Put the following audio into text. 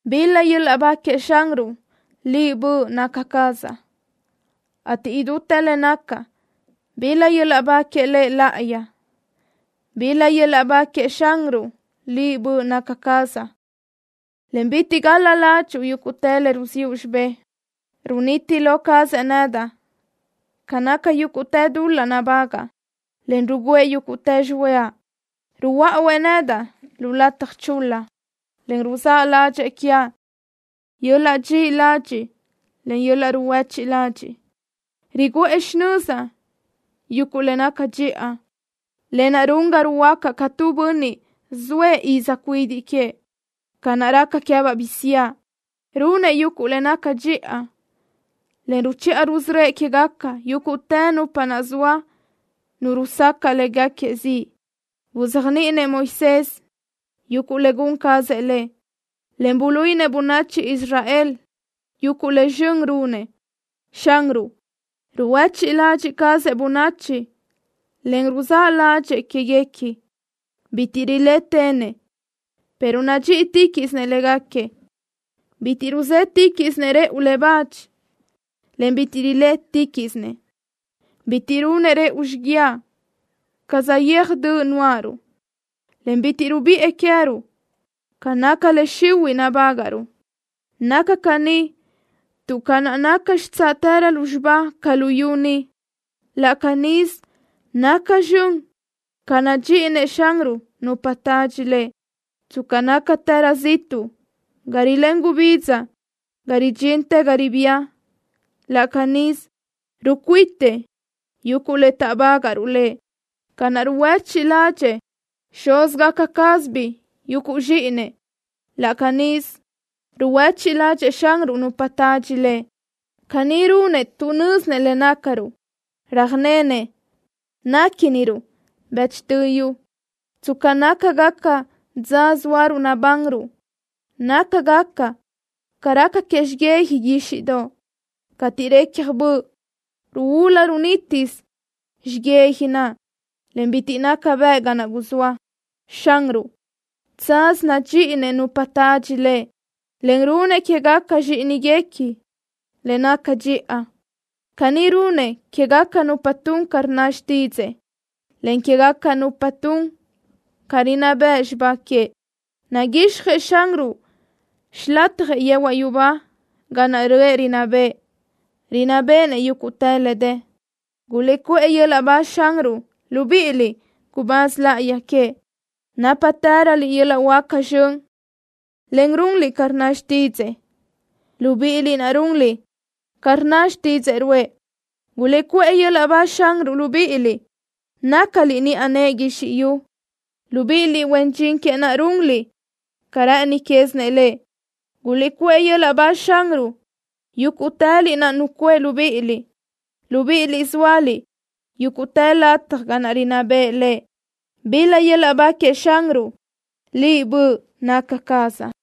¡Bil-la yöl-laʼ ba queëʼ Xanruʼ, liʼ, böʼ naca cazaʼ, ateʼ idútë le nacaʼ, bil-la yöl-laʼ ba que Lëʼ láʼayi! ¡Bil-la yöl-laʼ ba queëʼ Xanruʼ, liʼ, böʼ naca cazaʼ, en bitiʼ gal-la ládxuʼu yúguʼtë le ruziʼu xibë́ʼ! Runiti lo cazëʼ nedaʼ ca naca yúguʼtë dul-laʼ nabágaʼa, en rugǘëʼ yúguʼtë xihuëʼa. Ruhuöáʼuëʼ nedaʼ lu lataj chul-la, en ruzáʼ ládxëʼë quiaʼ yöl-laʼ dxiʼi ladxiʼ, en yöl-laʼ ruhuéchiʼ ladxiʼ. Riguʼë xinözaʼ yuguʼ le naca dxiʼa, lë naʼ run ga ruhuöácaʼ ca tu bönniʼ zoëʼ iz cuidiʼ queëʼ, ca naʼ raca queë́baʼ bisiáʼ. Runëʼ yuguʼ le naca dxiʼa, en ruchiʼa rusörö́ëʼ quégaca yúguʼtë nupa zoa nu rusacaʼ léguequi ziʼ. Buzéajniʼinëʼ Moisés yuguʼ le gun cazëʼ Lëʼ, en buluíʼinëʼ bönachi Israel yuguʼ le zxön runëʼ. Xanruʼ ruhuéchiʼ ladxiʼ cazëʼ bönachi, en ruzáʼ ládxëʼë quéguequi. Bitiʼ rilétenëʼ, pero nadxíʼitiquiʼsinëʼ léguequi. Bitiʼ ruzétiquiʼsinëʼ rëʼu le bach, en bitiʼ rilétiquiʼsinëʼ. Bitiʼ runëʼ rëʼu xiguiaʼ ca saʼyéaj döʼ nuáʼaruʼ, en bitiʼ rubiʼë queëruʼ ca naca le xihuiʼ nabágaʼruʼ. Naca caní tuʼ ca naʼ naca xitsáʼtërö lúzxiba ca luyú ni, laʼ canísö naca zxön ca nadxíʼinëʼ Xanruʼ nupa tadxi Lëʼ. Tsca nácatërö ziʼtuʼ ga rilén gubidza ga ridxintë ga ribía, laʼ canísö rucuitëʼ yuguʼ le taʼbágaʼruʼ Lëʼ. Ca naʼ ruhuéchiʼ ládxëʼë xúzgaca cázabiʼ yuguʼ zxíʼinëʼ, laʼ canísö ruhuéchiʼ ládxëʼë Xanruʼ nupa tadxi Lëʼ. Caní runëʼ tuʼ nö́zinëʼ le nácaruʼ. Röjnenëʼ néquiniruʼ bëchtö yu. Tsca nácagaca dza zóaruʼ nabanruʼ, nácagaca ca raca que xiyija guíxiʼdoʼ. Cateʼ recaj böʼ, ruúlu runítisö xiyija naʼ, en bitiʼ naca bëʼ ga naʼ guzóa. Xanruʼ, tsaz nadxíʼinëʼ nupa tadxi Lëʼ, en runëʼ quégaca zxíʼiniguequi le naca dxiʼa. Caní runëʼ quégaca nupa tun ca rnna xtídzëʼë, en quégaca nupa tun ca rinná bëʼ xibá queëʼ. Naguixjëʼ Xanruʼ xilatjëʼ yehuaʼ yubá ga naʼ röʼë rinná bëʼë. Rinná béʼenëʼ yúguʼtë le dë. ¡Guliʼcuʼë yöl-laʼ ba Xanruʼ, libíʼiliʼ, gubáz láʼayi queëʼ, nápatëröliʼ yöl-laʼ huáca zxön, en runliʼ ca rnna xtídzëʼë, libíʼiliʼ naʼ runliʼ ca rnna didzaʼ ruʼë! ¡Guliʼcuʼë yöl-laʼ ba Xanruʼ, libíʼiliʼ nácaliʼ niʼa nëʼë guizxi yu, libíʼiliʼ, huen dxin queëʼ naʼ, runliʼ ca rë́ʼëni quézinëʼ Lëʼ! ¡Guliʼcuʼë yöl-laʼ ba Xanruʼ, yúguʼtëliʼ naʼ nucuʼë libíʼiliʼ, libíʼiliʼ zóaliʼ yúguʼtë lataj ga naʼ rinná bëʼë Lëʼ! ¡Bil-la yöl-laʼ ba queëʼ Xanruʼ, liʼ, böʼ naca cazaʼ!